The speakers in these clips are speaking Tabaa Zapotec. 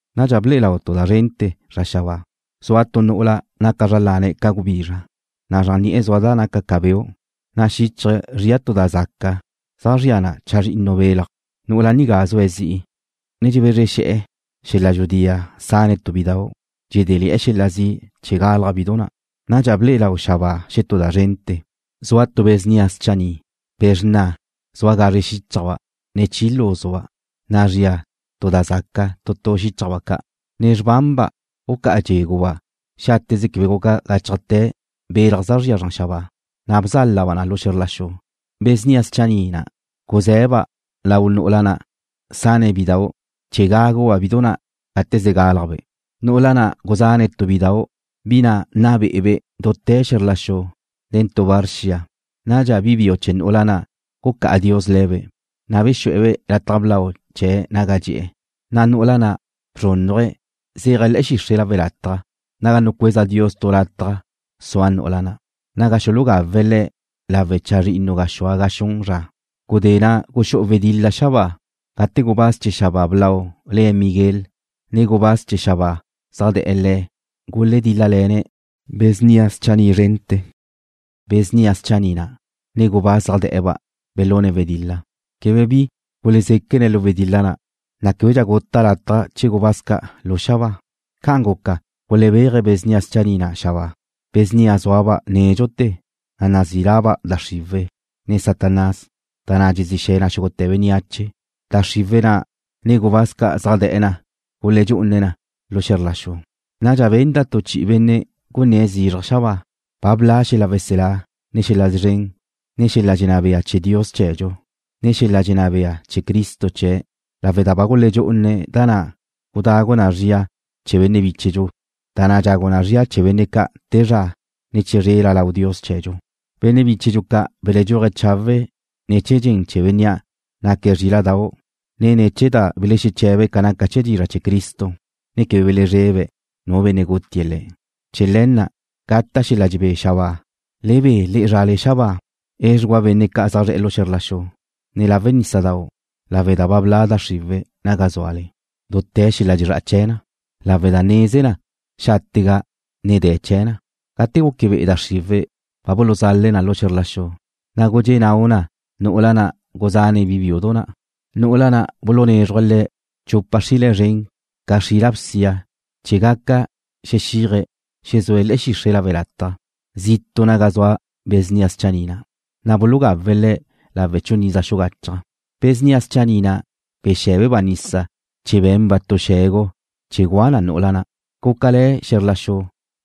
Nadxa ble'e lau tu da zrente̱ xabáa. Zua tu nu'ula naca zra lane̱' ca gubizra, na' zran ni'e̱ zua da naca ca beu', na' xíchaje̱' zria tu da zaca zaj zria na chazrinnu belaj. Nu'ula nigá zue̱' zi'i, ne dxebezre xe̱'e̱ xel-la' dxudi'a sane̱' tu bidau', dxedéle̱'e̱ xel-la' zi' chee̱ galaj bidu na'. Nadxa ble'e lau xabáa xetú da zrente̱, zua tu be̱ snia schanni', be̱ xrna, zua gazre xíchajba' ne chi lúzuba', na' zria tu da zaca tu tu xíchajba' ca'. Nen xrbanba' gucá'a dxé̱guba' xáteze quebe guca gáchajte̱ belaj zaj zria zran xabáa, na' bzálaba' na lu xe̱zr la xu. Be̱ snia schanni' na' guze̱ba' lau nu'ula na' sane̱' bidau' chee̱ gáguba' bidu na' gate ze gálajbe'. Nu'ula na' guzane̱' tu bi biudau', bi na' nna be'ebe' dute̱ xe̱zr la xu nen tu var xia. Nadxa bi biu chee̱ nu'ula na' gucá'a Dios le̱be', na' bexu'e̱-be' lataj blau chee̱' naga dxe'e̱. Na' nu'ula na' bzrúnnuje̱' zéaje̱' le̱'e̱ xixre' lawe' lataj naga nucueza Dios tu lataj naga sua nu'ula na', naga xulugawe̱' le̱' lawe' chazrinnu gaxúa ga xun zra. Gudé na' guxú'u wedil-la xabáa gate gubáz chee̱ xabáa blau le̱' Miguel nen gubáz chee̱ xabáa zaj da' le̱' guledíl-lalene̱' be̱ snia schanni' zrente̱. Be̱ snia schanni' na', ne gubáz zaj de̱'e̱-ba' belune̱' wedil-la. Quebe bi gulezéquene̱' lu wedil-la na', na' québedxa guta' lataj chee̱ gubáz ca' lu xabáa. Ca'an guca gulebéaje̱' be̱ snia schanni' na' xabáa, be̱ snia na' zúaba' nédxute̱, na' nazí laba' da xriwe̱', ne Satanás, da na' dxezí xe̱ na xúgute̱ bénneache. Da xriwe̱' na', ne gubáz ca' zaj de̱'e̱ na guledxú'une̱' na lu xe̱zr la xu. Nadxa benda' tu chi'i benne' gunné̱' zizraj xabáa: ―Ba bla' xel-la' weselá, ne xel-la' szren, ne xel-la' dxenná bea chee̱ Dios chee̱dxu, ne xel-la' dxenná bea chee̱ Cristo chee̱', lawe' da ba guledxú'une̱' da na' gudagu zria na chee̱ benne' bíchedxu, da na' dxagu zria na chee̱ benne' ca' te zra, ne chizrela lau Dios chee̱dxu. Benne' bíchedxu ca' beledxúaje̱' chawe' ne̱ chee̱ dxen chee̱ Bénnea' naque̱' Zríla'dau', ne ne̱ chee̱ da belexeche̱be̱' ca naca chee̱ dizra' chee̱ Cristo, ne quebe belezrebe̱' nu benne' gutie̱' le̱'. Chee̱ le̱ na' gata' xel-la' dxebé xabáa. ¡Le be le'e zrale xabáa! ¡Edxugua benne' ca' zaj zre̱'e̱ xe̱zr la xu, ne lawe' nísadau' lawe' da ba bla' da xriwe̱' naga zúale, dute̱ xel-la' dxezrá'a chee̱ na, lawe' da neze na xáte'ga ne de̱ chee̱ na! Gate guque be'e da xriwe̱' ba buluzale̱' na lu xe̱zr la xu, na' gudxé' nau na nu'ula na' guzane̱' bi biudu na'. Nu'ula na' bulunézruje̱' le̱' chupa xrile̱' zren ca xrila bsia chee̱ gaca xexiaje̱' xezue̱' le̱'e̱ xixre' lawe' lataj, zitu' naga zua be̱ snia schanni' na', na' bulugawe̱' le̱' lawe' chun iza xugachaj. Be̱ snia schanni' na' bexé̱beba' nisa chee̱ be̱nba' tu xe̱gu chee̱ gua na nu'ula na'. Gúcale̱ xe̱zr la xu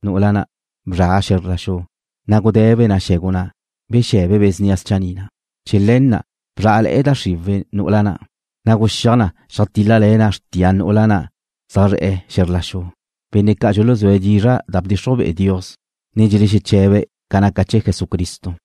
nu'ula na'. Bzra xe̱zr la xu, na' gude̱be na xe̱gu na' bexe̱be be̱ snia schanni' na'. Chee̱ le̱ na' bzrá'le̱'e̱ da xriwe̱' nu'ula na', na' guxíaj na xeajtíl-lale̱ na xrtia nu'ula na' zaj zre̱'e̱ xe̱zr la xu, benne' ca' dxuluzúe̱' dizra' da bdxixruj be'e Dios, ne dxelexeche̱be̱' ca naca chee̱ Jesucristo.